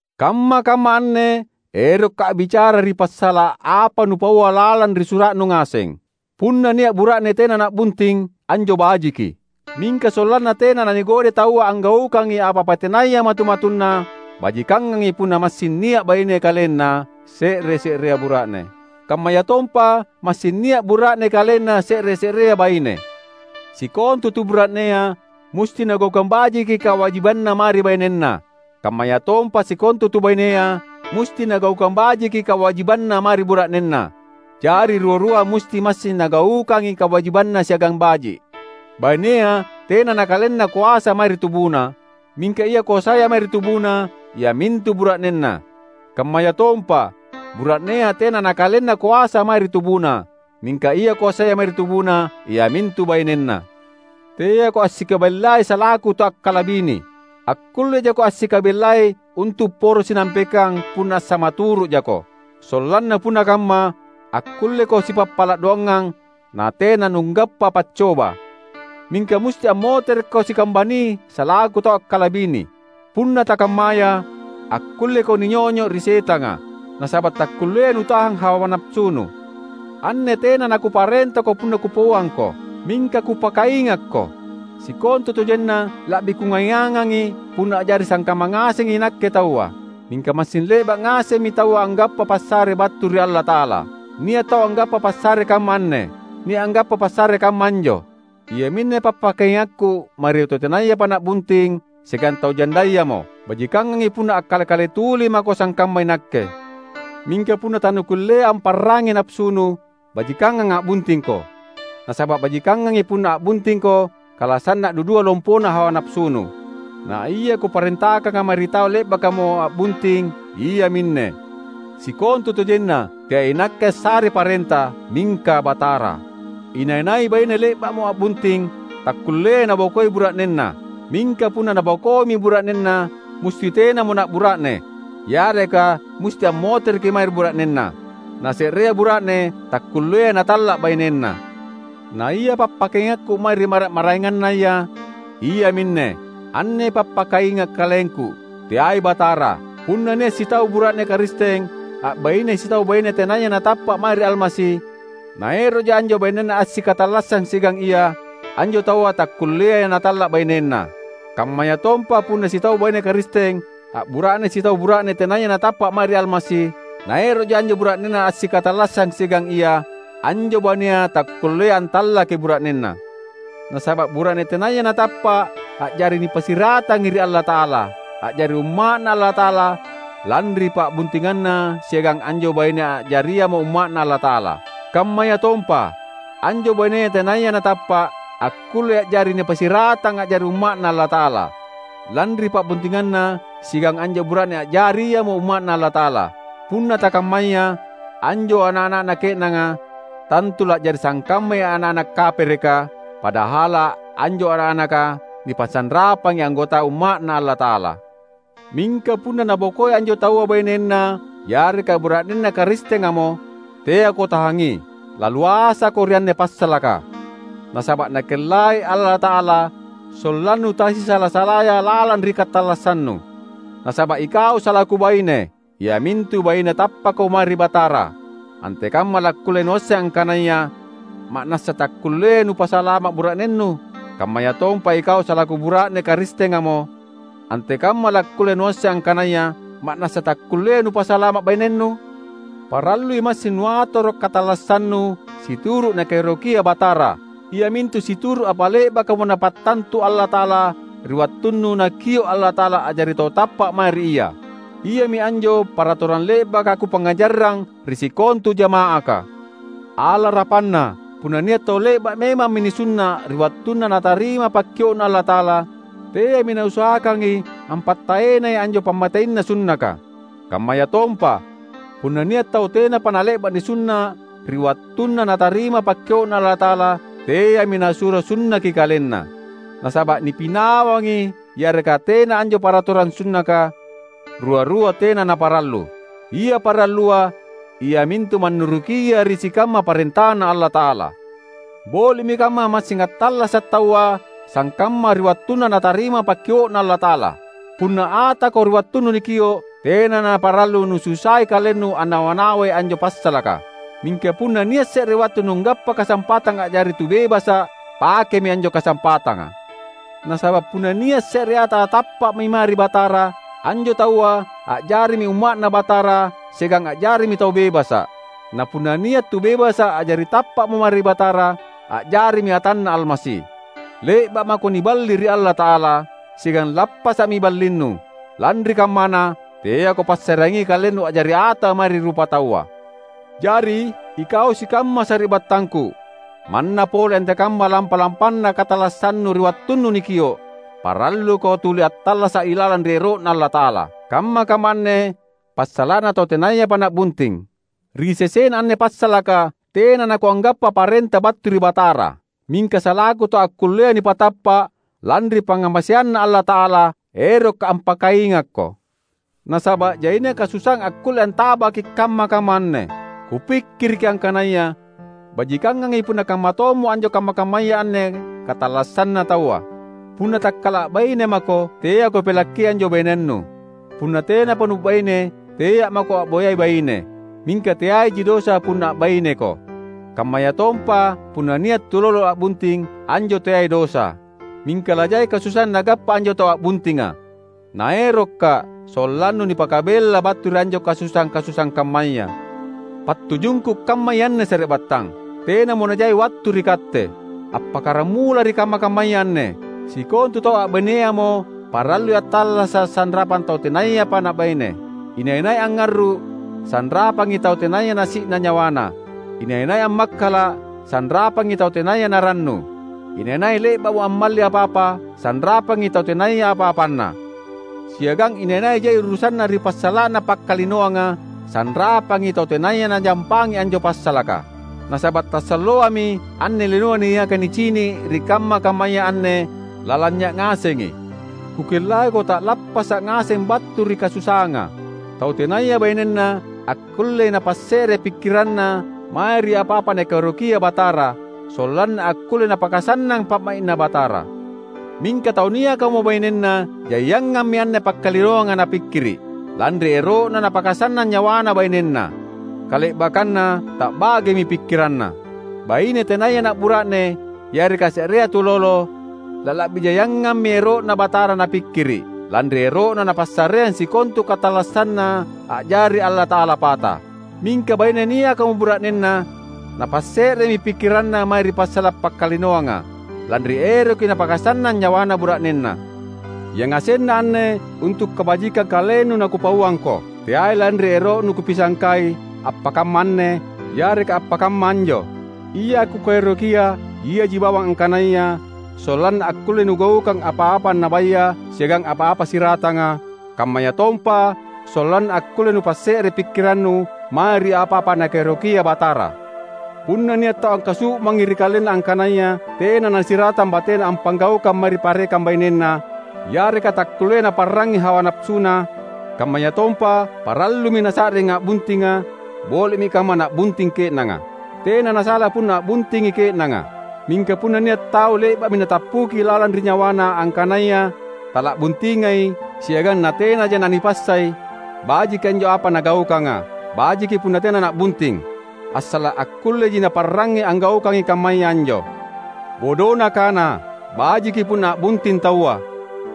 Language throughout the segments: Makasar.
Kamma-kamma anne erokka’ a’bicara ri passala’ apa nupaua lalang ri sura’nu ngaseng. Punna nia’ bura’ne tena na’bunting, anjo bajiki. Mingka sollanna tena nanigodai taua anggaukangi apa-apa tenaya matu-matunna, bajikangangi punna massing nia’ baine kalenna se’re-se’rea bura’ne, kammayatompa massing nia’ bura’ne kalenna se’re-se’rea baine. Sikontu tu bura’nea musti nagaukang bajiki kawajibanna mae ri bainenna, kammayatompa sikontu tu bainea musti nagaukang bajiki kawajibanna mae ri bura’nenna; jari rua-rua musti massing nagaukangi kawajibanna siagang baji’. Bainea tena nakalenna koasa mae ri tubuna; mingka ia koasaya mae ri tubuna iamintu bura’nenna. Kammayatompa, bura’nea tena nakalenna koasa mae ri tubuna; mingka ia koasaya mae ri tubuna iamintu bainenna. Teako assikabellai salaku tau akkalabini. Akkulle jako assikabellai untu’ poro sinampekang punna assamaturu’ jako. Sollanna punna kamma, akkulleko sipappala’ doangang natena nunggappa paccoba. Mingka musti ammoterekko sikambani salaku tau akkalabini. Punna takammaya, akkulleko ninyonyo’ ri setanga, nasaba’ takkulleai nutahang hawa napasunu. Anne tena nakuparentako punna kupauangko, mingka kupakaingakko. Sikontutojenna la’bi kungaiangangi punna a’jari sangkamma ngasengi inakke taua. Mingka massing le’ba’ ngasemmi taua anggappa passare battu ri Allata’ala. Nia’ tau anggappa passare kamma anne, nia’ anggappa passare kamma anjo. Iaminne pappakaingakku mae ri tau tenayapa na’bunting siagang tau jandayamo: Bajikangangi punna akkale-kale tuli mako sangkamma inakke. Mingka punna tanukulleai amparrangngi napasunu, bajikangang a’buntingko. Nasaba’ bajikangangi punna a’buntingko kala sanna’ dudua lompona hawa napasunu. Naia kuparentakanga mae ri tau le’bakamo a’bunting iaminne: (Sikontutojenna teai inakke assarei parenta mingka Batara.) Inai-nai baine le’ba’mo a’bunting, takkulleai nabokoi bura’nenna. Mingka punna nabokoimi bura’nenna, musti tenamo na’bura’ne, yareka musti ammotereki mae ri bura’nenna. Na se’rea bura’ne takkulleai natalla’ bainenna. Naia pappakaingakku mae ri mara’-maraengannaya, iaminne: — anne pappakainga’ kalengku, teai Batara — punna nia’ sitau bura’ne Karisteng a’baine sitau baine tenaya natappa’ mae ri Almasi, naero’ja anjo bainenna assikatallassang siagang ia, anjo taua takkulleai natalla’ bainenna. Kammayatompa punna sitau baine Karisteng a’bura’ne sitau bura’ne tenaya natappa’ mae ri Almasi, naero’ja anjo bura’nenna assikatallassang siagang ia, anjo bainea takkulleai antallaki bura’nenna. Nasaba’ bura’ne tenaya natappa’ a’jari nipassiratangi ri Allata’ala, a’jari umma’Na Allata’ala lanri pa’buntinganna siagang anjo baine a’jariamo umma’Na Allata’ala. Kammayatompa, anjo baine tenayapa natappa’, akkullei a’jari nipassiratang a’jari umma’Na Allata’ala, lanri pa’buntinganna siagang anjo bura’ne a’jariamo umma’Na Allata’ala. Punna takammaya, anjo ana’-ana’na ke’nanga tantu la’jari sangkammai ana’-ana’ kapereka, padahala’ anjo ana’-anaka nipasanrapangi anggota umma’Na Allata’ala. Mingka punna nabokoi anjo taua bainenna yareka bura’nenna Karistengamo, teako tahangi. Laluasako ri anne passalaka, nasaba’ Nakellai Allata’ala sollannu tasisala-salaya lalang ri katallassannu. Nasaba’ ikau salaku baine, iamintu baine tappakamo mae ri Batara, antekamma lakkulle nuasseng angkanaya ma’nassa takkulleai nupasalama’ bura’nennu? Kammayatompa ikau salaku bura’ne Karistengamo, antekamma lakkulle nuasseng angkanaya ma’nassa takkulleai nupasalama’ bainennu? Parallui massing nuatoro’ katallassannu situru’ Nakaerokia Batara, iamintu situru’ apa le’bakamo Napattantu Allata’ala ri wattunnu Nakio’ Allata’ala a’jari tau tappa’ mae ri Ia. Iami anjo paratorang le’baka kupangngajarrang ri sikontu jama’aka. Alarapanna, punna nia’ tau le’ba’ memammi nisunna’ ri wattunna natarima pakkio’Na Allata’ala, teami nausahakangi ampattaenai anjo pammateina sunnaka. Kammayatompa, punna nia’ tau tenapa nale’ba’ nisunna’ ri wattunna natarima pakkio’Na Allata’ala, teami nasuro sunnaki kalenna. Nasaba’ nipinawangi yareka tena anjo paratorang sunnaka, rua-rua tena naparallu. Ia parallua iamintu mannurukia ri sikamma parentaNa Allata’ala. Boli’mi kamma massing attallasa’ taua sangkamma ri wattunna natarima pakkio’Na Allata’ala. Punna atako ri wattunnu nikio’, tena naparallu nususai kalennu annawa-nawai anjo passalaka. Mingka punna nia’ se’re wattu nunggappa kasampatang a’jari tu bebasa’, pakemi anjo kasampatanga. Nasaba’ punna nia’ se’re ata tappa’mi mae ri Batara, anjo taua a’jarimi umma’Na Batara siagang a’jarimi tau bebasa’. Na punna nia’ tu bebasa’ a’jari tappa’mo mae ri Batara, a’jarimi atanNa Almasi. Le’ba’ mako niballi ri Allata’ala, siagang lappasa’mi ballinnu. Lanri kammana, teako passareangi kalennu a’jari ata mae ri rupataua. Jari, ikau sikamma sari’battangku, manna pole antekamma lampa-lampana katallassannu ri wattunnu nikio’, paralluko tuli attallasa’ ilalang ri ero’Na Allata’ala. Kamma-kamma anne passala’na tau tenayapa na’bunting. Ri sesena anne passalaka tena nakuanggappa parenta battu ri Batara. Mingka salaku tau akkullea nipatappa’ lanri pangngamaseanNa Allata’ala, erokka’ ampakaingakko. Nasaba’ jaina kasusaang akkulle antabaki’ kamma-kamma anne, kupikkiriki angkanaya bajikangangi punna kamma tommo anjo kamma-kammaya anne katallassanna taua. Punna takkala a’baine mako, teako pelakki anjo bainennu. Punna tenapa nu’baine, tea’ mako a’boyai baine. Mingka teaiji dosa punna a’baineko. Kammayatompa punna nia’ tulolo a’bunting, anjo teai dosa. Mingka lajai kasusaang nagappa anjo tau a’buntinga. Naerokka’ sollannu nipakabella battu ri anjo kasusaang-kasusaang kammaya. Pattujungku kammai anne sari’battang: Tenamo najai wattu ri katte. Appakkaramula ri kamma-kammaya anne, sikontu tau a’baineamo parallui attallasa’ sanrapang tau tenayapa na’baine; inai-nai angngarru’, sanrapangi tau tenaya nasi’na nyawana; inai-nai ammakkala’, sanrapangi tau tenaya narannu; inai-nai le’ba’mo ammalli apa-apa, sanrapangi tau tenaya apa-apanna; siagang inai-nai jai urusanna ri passala’na pakkalinoanga, sanrapangi tau tenaya najampangi anjo passalaka. Nasaba’ tasalloami anne linoa niaka nicini’ ri kamma-kammaya anne lalanynya’ ngasengi. Kukellaiko ta’lappasa’ ngaseng battu ri kasusaanga. Tau tenaya bainenna akkullei napasse’re pikkiranna mae ri apa-apa Nakaerokia Batara, sollanna akkulle napakasannang pa’mai’Na Batara. Mingka tau niakamo bainenna jaiangammi anne pakkalinoanga napikkiri’, lanri ero’na napakasannang nyawana bainenna; kale’bakkanna ta’bagemi pikkiranna. Baine tenaya na’bura’ne, yareka se’rea tulolo, lala’bi jaiangammi ero’Na Batara napikkiri’, lanri ero’na napassareang sikontu katallassanna a’jari Allata’ala pata. Mingka baine niakamo bura’nenna, napasse’remi pikkiranna mae ri passala’ pakkalinoanga, lanri eroki napakasannang nyawana bura’nenna. Yangasenna anne untu’ kabajikang kalennu nakupauangko; teai lanri ero’nu kupisangkai appakamma anne yareka appakamma anjo. Ia kukaerokia iaji bawang angkanaya sollanna akkulle nugaukang apa-apa annabaya siagang apa-apa siratanga; kammayatompa sollanna akkulle nupasse’re pikkirannu mae ri apa-apa Nakaerokia Batara. Punna nia’ tau angkasu’mangi ri kalenna angkanaya tena nasiratang batena appanggaukang mae ri parekang bainenna, yareka takkulleai naparrangngi hawa napasuna, kammayatompa parallumi nasa’ring a’buntinga, boli’mi kamma na’bunting ke’nanga. Tena nasala punna a’buntingi ke’nanga. Mingka punna nia’ tau le’ba’mi natappuki lalang ri nyawana angkanaya tala’buntingai, siagang natenaja nanipassai, bajiki anjo apa nagaukanga; bajiki punna tena na’bunting, assala’ akkulleji naparrangangi anggaukangi kammaya anjo. Bodona kana, bajiki punna a’bunting taua,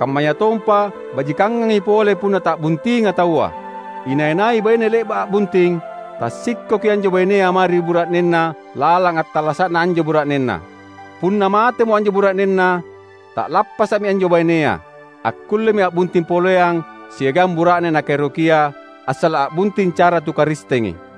kammayatompa bajikangangi pole punna ta’buntinga taua. Inai-nai baine le’ba’ a’bunting, tassikkoki anjo bainea mae ri bura’nenna lalang attallasa’na anjo bura’nenna. Punna matemo anjo bura’nenna, ta’lappasa’mi anjo bainea. Akkullemi a’bunting poleang siagang bura’ne nakaerokia, assala’ a’bunting cara tu Karistengi.